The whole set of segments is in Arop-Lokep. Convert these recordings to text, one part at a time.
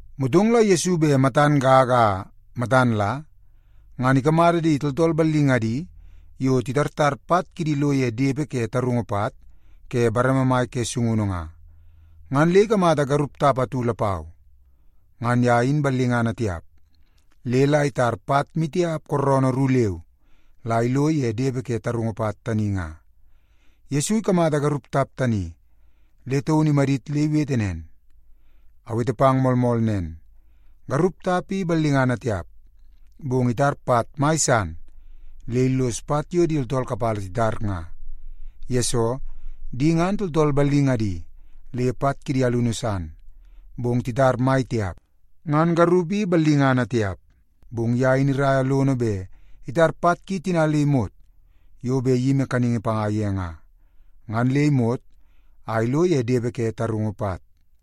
Motong la Yesu bet matan gaga a matan la ngan ikamata di tooltool ballingadi yo titartar pat kidi lo ye depe ke tarungu pat ke bareme mai ke sungunu nga, ngan le ikamata garup tap atu lapau. Ngan ye in ballingana tiap, le la itar pat maitiap kooroonoo ru leu la ilo ye depe ke tarungu pat tani nga. Yesu ikamata garup tap tani, le taun imadit le iwete nen, “Awete pang moolmool nen, garup tap i ballingana tiap, bong itar pat mai san le illos pat yo di tooltool kapala titar nga, yesoo, di ngan tooltool ballingadi le pat kidi alunu san, bong titar mai tiap. Ngan garup i ballingana tiap, bong ye in iraia lono bet itar pat ki tina yo bet iyimi kaningi panga ye nga, ngan le imot a ilo ye depe ke tarungu pat.”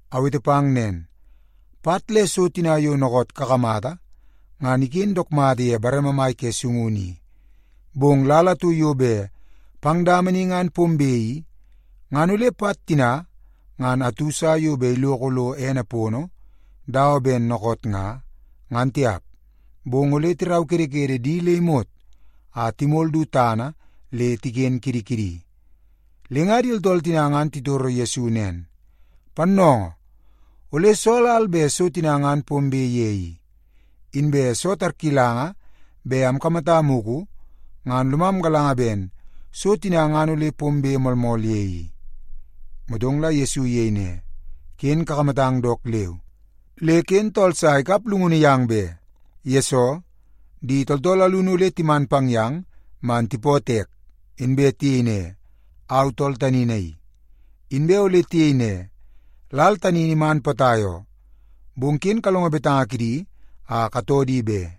“Awete pang nen, pat le so tina yo dookoot kakamata ngan iken dook mata ye bareme mai ke sungunu i, bong lal atu yo bet pang dama ni ngan pombe i, ngan ole pat tina ngan atu sa yo bet iloko lo ene pono dawa ben dookoot nga, ngan tiap. Bong ole tiraukedekede di le imot a timol du tana le tiken kidi kidi.” Le nga di tooltool tina ngan titoro Yesu nen, “Pannoongoo, ole soo lal bet so tina ngan pombe ye i? Inbe soo tarkilanga bet amkamata mugu, ngan lomam galanga ben so tina ngan ole pombe moolmool ye i.” Motong la Yesu iyei ne, “Ken kakamatang dook leu, le ken tool sa ikap llungunu yang be. Yesoo, di tooltool alunu ole timan pang yang man tipootoo ek, inbe tiyei ne, ‘Au tool tani naii!’ Inbe ole tiyei ne, ‘Lal tani in iman potai oo.’ Bong ken kalongo betanga kidi a katoo di be.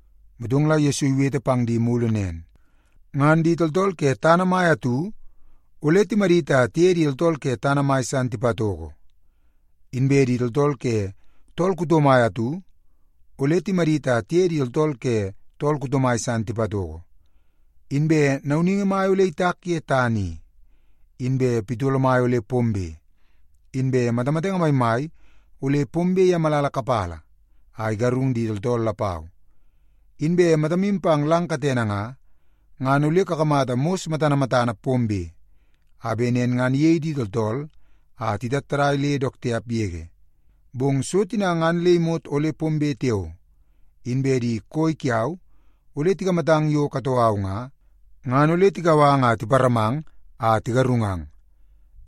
Motong la Yesu iwete pang di mulu nen, “Ngan di tooltool ke tana mai atu ole timadit a tiye di tooltool ke tana mai san tipatoko. Inbe di tooltool ke tool kuto mai atu ole timadit a tiye di tooltool ke tool kuto mai san tipatoko. Inbe nauningi mai ole itak ye tana i, inbe pitolo mai ole pombe, inbe matamatenge maimai ole pombe ye malala kapala a igarung di tooltool lapau. Inbe matamu pang lang katene nga, ngan ole kakamata mos matana matana pombe, a bet nen ngan iyei di tooltool a titattadai le dook tiap yege. “Bong so tina ngan le imot ole pombe tiao, inbe di koi kiau ole tikamatang yo katoo au nga, ngan ole tikau ang a tiparamang a tigarungang.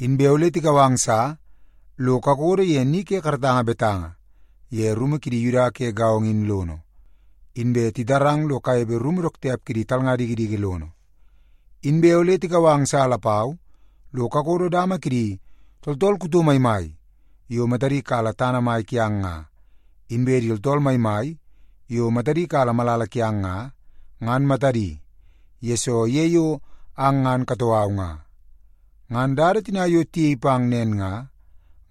Inbe ole tikau ang sa lo kakodo ye ni ke karatanga betanga ye rumu kidi Yuda ke gaongo in lono, inbe titarang lo kanepe rumu dook tiap kidi talnga dikidiki lono. Inbe ole tikau ang sa lapau lo kakodo dama kidi tooltool kuto maimai yo matadi kala tana mai kiang nga, inbe di tooltool maimai yo matadi kala malala kiang nga, ngan matadi, yesoo ye yo ang ngan katoo au nga. Ngan dada tina yo tiyei pang nen nga,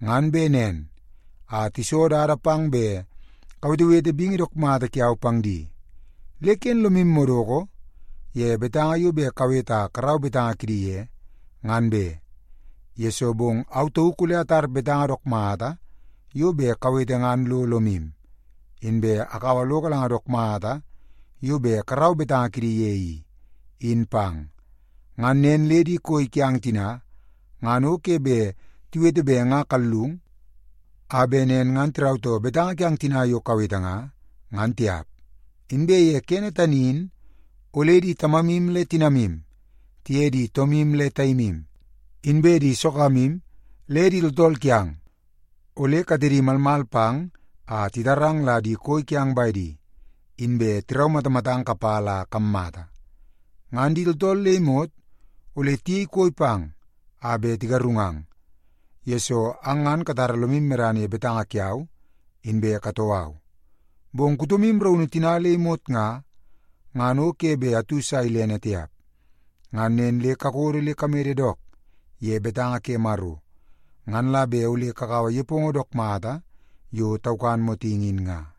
ngan bet nen a tiso dada pang bet kawetewete bingi dook mata kiau pang di. Le ken lomu madoko ye betanga yo bet kawete a karau betanga kidi ye, ngan be, yesoo bong au tauk ole atar betanga dook mata yo bet kawete ngan lo lomu, inbe akaua lo galanga dook mata yo bet karau betanga kidi ye i, in pang. Ngan nen le di koi kiang tina ngan o ke bet tiwete bet nga kallung, a bet nen ngan tirautoo betanga kiang tina yo kawete nga, ngan tiap. Inbe ye kene tani in, ole di tamamu le tinamu, tiye di toomu le taimu, inbe di sogamu le di tooltool kiang ole katedi malmal pang a titarang la di koi kiang bedi, inbe tiraumatamatang kapala a kammata. Ngan di tooltool le imot ole tiyei koi pang a bet tigarungang, yesoo ang ngan katara lomu medana ye betanga kiau inbe katoo au. Bong kutomu raunu tina le imot nga, ngan o ke bet atu sa ilene tiap. Ngan nen le kakodo le kamede dook ye betanga ke Maro, ngan la bet ole kakaua nepongo dook mata yo taukan motingi in nga.”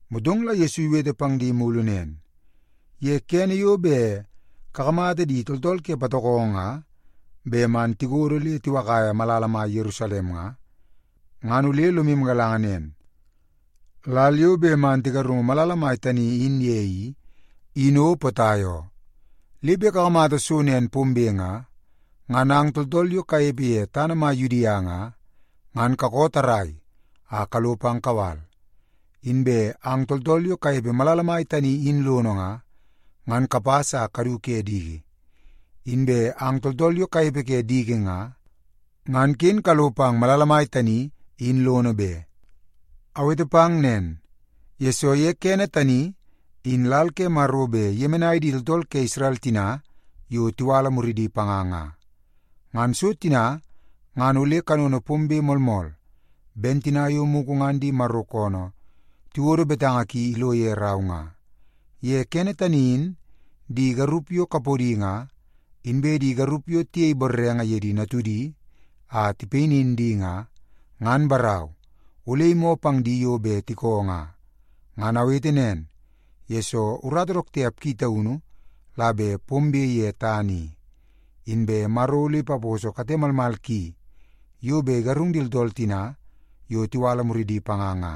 Motong la Yesu iwete pang di mulu nen, “Ye kene yo bet kakamata di tooltool ke patokongo nga bet man tikodo le tiwakaia malala mai Yerusalem nga, ngan ole lomu galanga nen, lal yo bet man tigarungu malala mai tani in ye i, in o potai oo. Le bet kakamata so nen pombe nga, ngan ang tooltool yo kanepe ye tana mai Yudia nga, ngan kakoo tarrai a kalo pang kawal. Inbe ang tooltool yo kanepe malala mai tani in lono nga, ngan kapas a kadu ke diki. Inbe ang tooltool yo kanepe ke diki nga, ngan ken kalo pang malala mai tani, in lono be. Awete pang nen, yesoo ye kene tani in lal ke Maro bet iyemenai di tooltool ke Isrel tina yo tiwala muridi panga nga. Ngan so tina ngan ole kanono pombe moolmool ben tina yo mugu ngan di Maro koonoo tiwodo betanga ki ilo ye rau nga. Ye kene tani in di garup yo kapodi nga, inbe di garup yo tiyei borrenge ye di natudi a tipayinin di nga, ngan barau, ole imoo pang di yo bet tikoo nga. Ngan awete nen, yesoo urata dook tiap ki taunu la bet pombe ye tana i, inbe Maro ole ipaposo kate malmal ki yo bet igarung di tooltool tina yo tiwala muridi panga nga.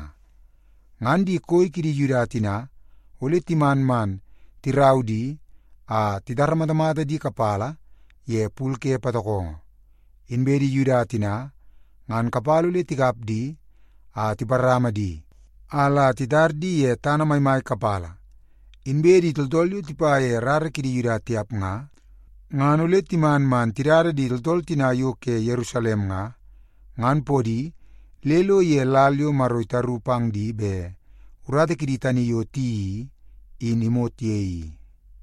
Ngan di koi kidi Yuda tina, ole timan man tirau di a titaramatamata di kapala ye pul ke patokongo. Inbe di Yuda tina ngan kapala ole tikap di a tiparama di a la titar di ye tana maimai kapala. Inbe di tooltool yo tipa ye rara kidi Yuda tiap nga, ngan ole timan man tidada di tooltool tina yo ke Yerusalem nga, ngan podi le ilo ye lal yo Maro itaru pang di bet urata kidi tani yo tiyeii i, in imot ye i.”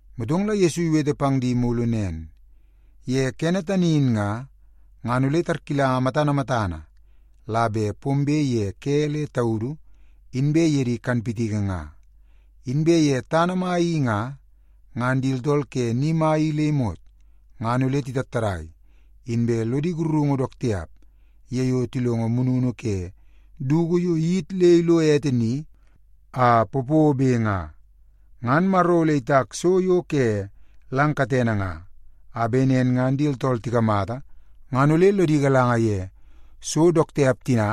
Motong la Yesu iwete pang di mulu nen, “Ye kene tani in nga, ngan ole tarkilanga matana matana la bet pombe ye ke le taudu inbe ye di kanpitiki nga. Inbe ye tana mai i nga, ngan di tooltool ke ni mai i le imot ngan ole titattadai inbe lodi sakarungu dook tiap ye yo tilongo mununu ke dugu yo iyit le ilo ete ni a popobe nga. Ngan Maro ole itak so yo ke lang katene nga, a bet nen ngan di tooltool tikamata ngan ole lodi galanga ye so dook tiap tina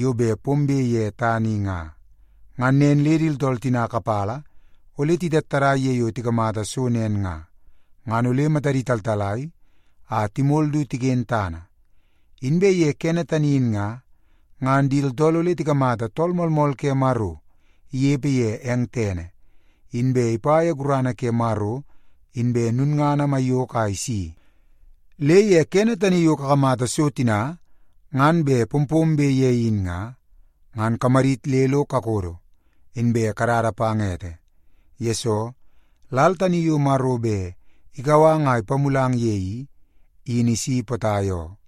yo bet pombe ye tana i nga. Ngan nen le di tooltool tina kapala ole titattadai ye yo tikamata so nen nga, ngan ole matadi taltalai a timol du tiken tana. Inbe ye kene tani in nga, ngan di tooltool ole tikamata Tool Moolmool ke Maro inepe ye eng tene, inbe ipa ye gurana ke Maro inbe lulngana maiyoko a isi. Le ye kene tani yo kakamata so tina ngan bet pompombe ye in nga, ngan kamadit le lo kakodo, inbe katada pang ete. Yesoo, lal tani yo Maro bet ikau ang a ipamulang ye i, in isi potai oo.”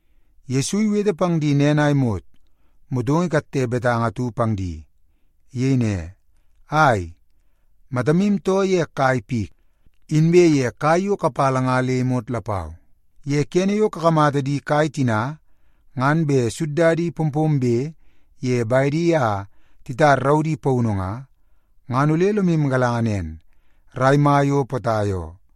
Yesu iwete pang di nen a imot, motong ikatte betanga atu pang di. Iyei ne, “Ai, matamu too ye kai pik, inbe ye kai yo kapala nga le imot lapau. Ye kene yo kakamata di kai tina ngan bet suddadi pompombe ye bedi a titar raudi paunu nga, ngan ole lomu galanga nen, rai mai o potai oo.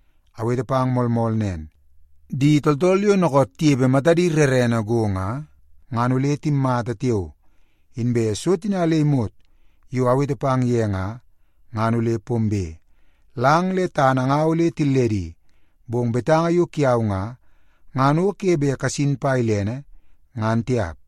“Awete pang moolmool nen, di tooltool yo dookoot tinepe matadi rerene go nga, ngan ole timmata tiao, inbe so tina le imot yo awete pang ye nga, ngan ole pombe. Lang le tana nga ole tilledi, bong betanga yo kiau nga, ngan o ke bet kasin pa ilene, ngan tiap.”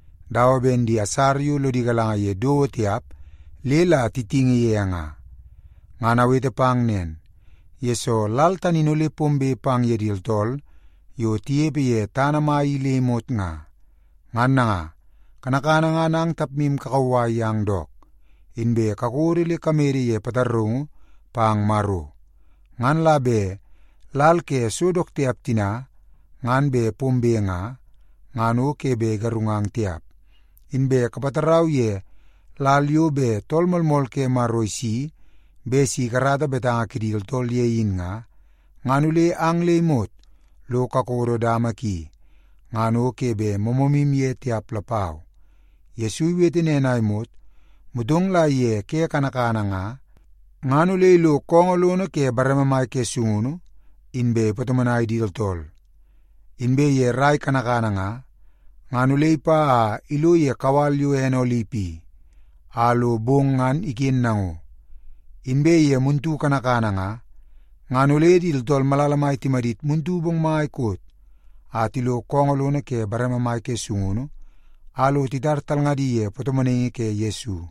dawa ben di asara yo lodi galanga ye dowo tiap le la titingi ye nga. Ngan awete pang nen, yesoo lal tani in ole pombe pang ye di tooltool yo tinepe ye tana mai i le imot nga. Ngan nanga, kanakana ngan ang tapmu kakauwai yang dook, inbe kakodo le kamede ye pataraungu pang Maro. Ngan la bet lal ke so dook tiap tina ngan bet pombe nga, ngan o ke bet igarungang tiap. Inbe kapatarau ye lal yo bet Tool Moolmool ke Maro isi bet si ikarata betanga kidi tooltool ye in nga, ngan ole ang le imot lo kakodo dama ki, ngan o ke bet moomoomu ye tiap lapau.” Yesu iwete nen a imot, motong la ye ke kanakana nga, ngan ole ilo koongoo lono ke bareme mai ke sungunu, inbe ipatomonai di tooltool. Inbe ye rrai kanakana nga, ngan ole ipa a ilo ye kawal yo ene Olip i, a lo bong ngan iken nango. Inbe ye muntu kanakana nga, ngan ole di tooltool malala mai timadit muntu bongmai koot a tilo koongoo lono ke bareme mai ke sungunu a lo titar talngadi ye patomonaingi ke Yesu.